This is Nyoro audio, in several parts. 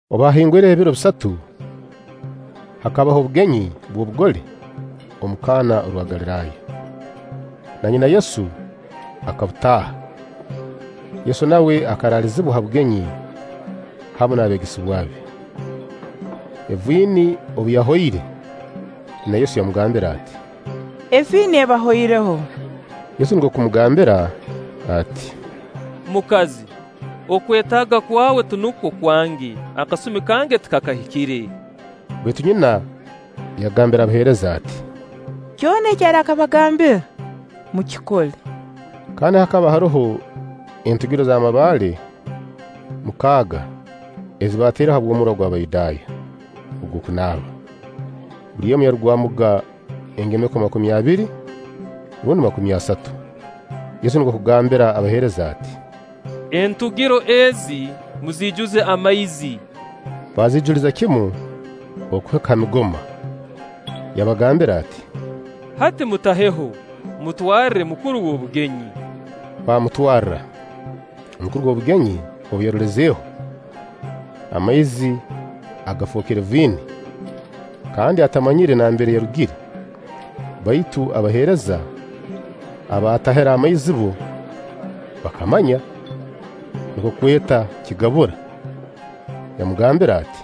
Obu haahingwireho ebiro bisatu, hakabaho obugenyi bw'obugole omu Kana orwa Galiraaya; na nyina Yesu akabutaaha. Yesu nawe akaraalizibwa ha bugenyi hamu n'abeegesebwa be. Eviini obu yahoire, nyina Yesu yamugambira ati: “Eviini ebahoireho.” Yesu nukwo kumugarukamu ati: “Mukazi, okwetaaga kwawe tinukwo kwange akasumi kange tikakahikire.” Baitu nyina yagambira abaheereza ati: “Kyona eki arakabagambira, mukikole.” Kandi hakaba haroho entugiro z'amabaale mukaaga ezi baataireho habw'omurwa gw'Abayudaaya ogw'okunaaba; buli emu yarugwamuga engemeko makumi abiri rundi makumi asatu. Yesu nukwo kugambira abaheereza ati: “Entugiro ezi muziijuze amaizi.” Baaziijuliza kimu okuhika ha migoma. Yabagambira ati: “Hati mutaheho, mutwarre mukuru w'obugenyi.” Baamutwarra. Mukuru w'obugenyi obu yarolezeeho amaizi agafookere viini, kandi atamanyire nambere yarugire (baitu abaheereza abaatahire amaizi bbo bakamanya), nukwo kweta kigabura, yamugambira ati: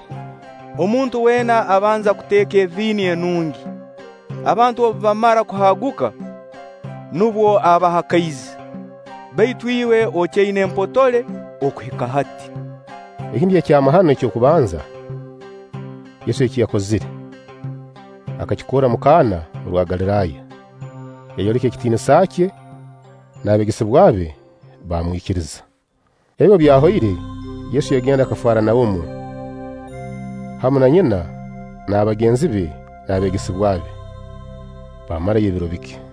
“Omuntu weena abanza kuteeka eviini enungi; abantu obu bamara kuhaaguka, nubwo abaha kaizi; baitu iwe okyaina empotole okuhika hati!” Eki nikyo ekyamahano eky'okubanza Yesu eki yakozire. Akakikorra omu Kana orwa Galiraaya, yayoleka ekitiinisa kye; n'abeegesebwa be baamwikiriza. Ebi obu byahoire, Yesu yagenda Kafaranaumu, hamu na nyina n'abagenzi be n'abeegesebwa be; baamarayo ebiro bike.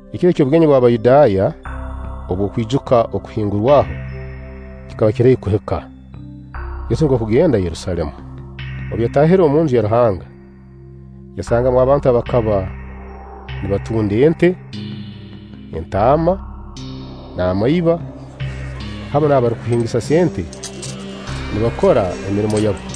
Ekiro eky'obugenyi bw'Abayudaaya obw'okwijuka Okuhingurwaho kikaba kiri haihi kuhika, Yesu nukwo kugenda Yerusaalemu. Obu yataahire omunju ya Ruhanga yasangamu abantu abakaba nibatunda ente, entaama, n'amaiba, hamu n'abarukuhingisa sente nibakora emirimo yabo.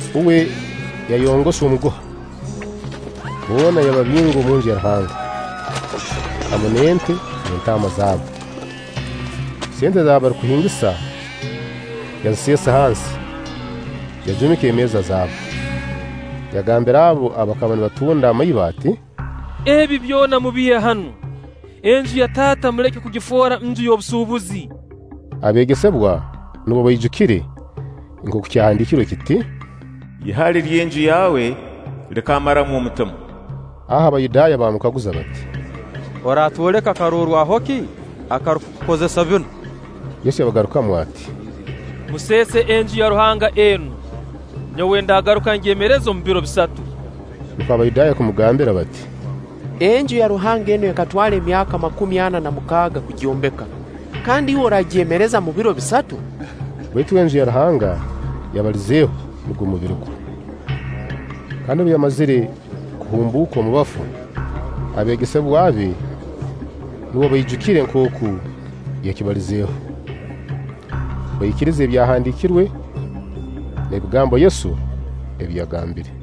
Uwe yayongosa omuguha, boona yababinga omunju ya Ruhanga, hamu n'ente n'entaama zaabo. Sente z'abarukuhingisa yaziseesa hansi, yajuumika emeeza zaabo. Yagambira abo abakaba nibatunda amaiba ati: “Ebi byona mubiihe hanu. Enju ya Taata muleke kugifoora nju y'obusuubuzi.” Abeegesebwa nubwo baijukire nkooku kyahandiikirwe kiti: “Ihali ry'enju yaawe likammaramu omutima.” Aho Abayudaaya baamukaguza bati: “Oratwoleka karorwaho ki akarukukukoza binu?” Yesu yabagarukamu ati: “Museese Enju ya Ruhanga enu, nyowe ndagaruka ngyemereze omu biro bisatu.” Nukwo Abayudaaya kumugambira bati: “Enju ya Ruhanga enu ekatwara emyaka makumi ana na mukaaga kugyombeka, kandi iwe oraagyemerereza omu biro bisatu?” Baitu uwe, Enju ya Ruhanga yabalizeeho, nugwo mubiri gwe. kandi obu yamazire kuhumbuuka omu bafu, abeegesebwa be nubwo baijukire nkooku yakibalizeeho; baikiriza Ebyahandiikirwe n'ebigambo Yesu ebi yagambire.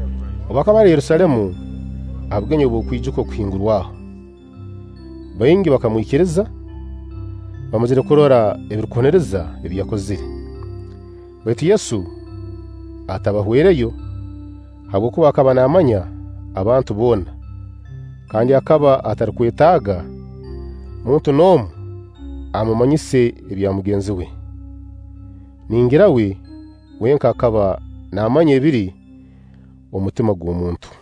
Obu akaba ali Yerusaalemu ha bugenyi obw'okwijuka Okuhingurwaho, baingi bakamwikiriza, bamazire kurora ebirukuhuniriza ebi yakozire; baitu Yesu atabahwereyo, habwokuba akaba naamanya abantu boona, kandi akaba atarukwetaaga muntu n'omu amumanyise ebya mugenzi we. Ningira uwe wenka akaba naamanya ebiri omu mutima gw'omuntu.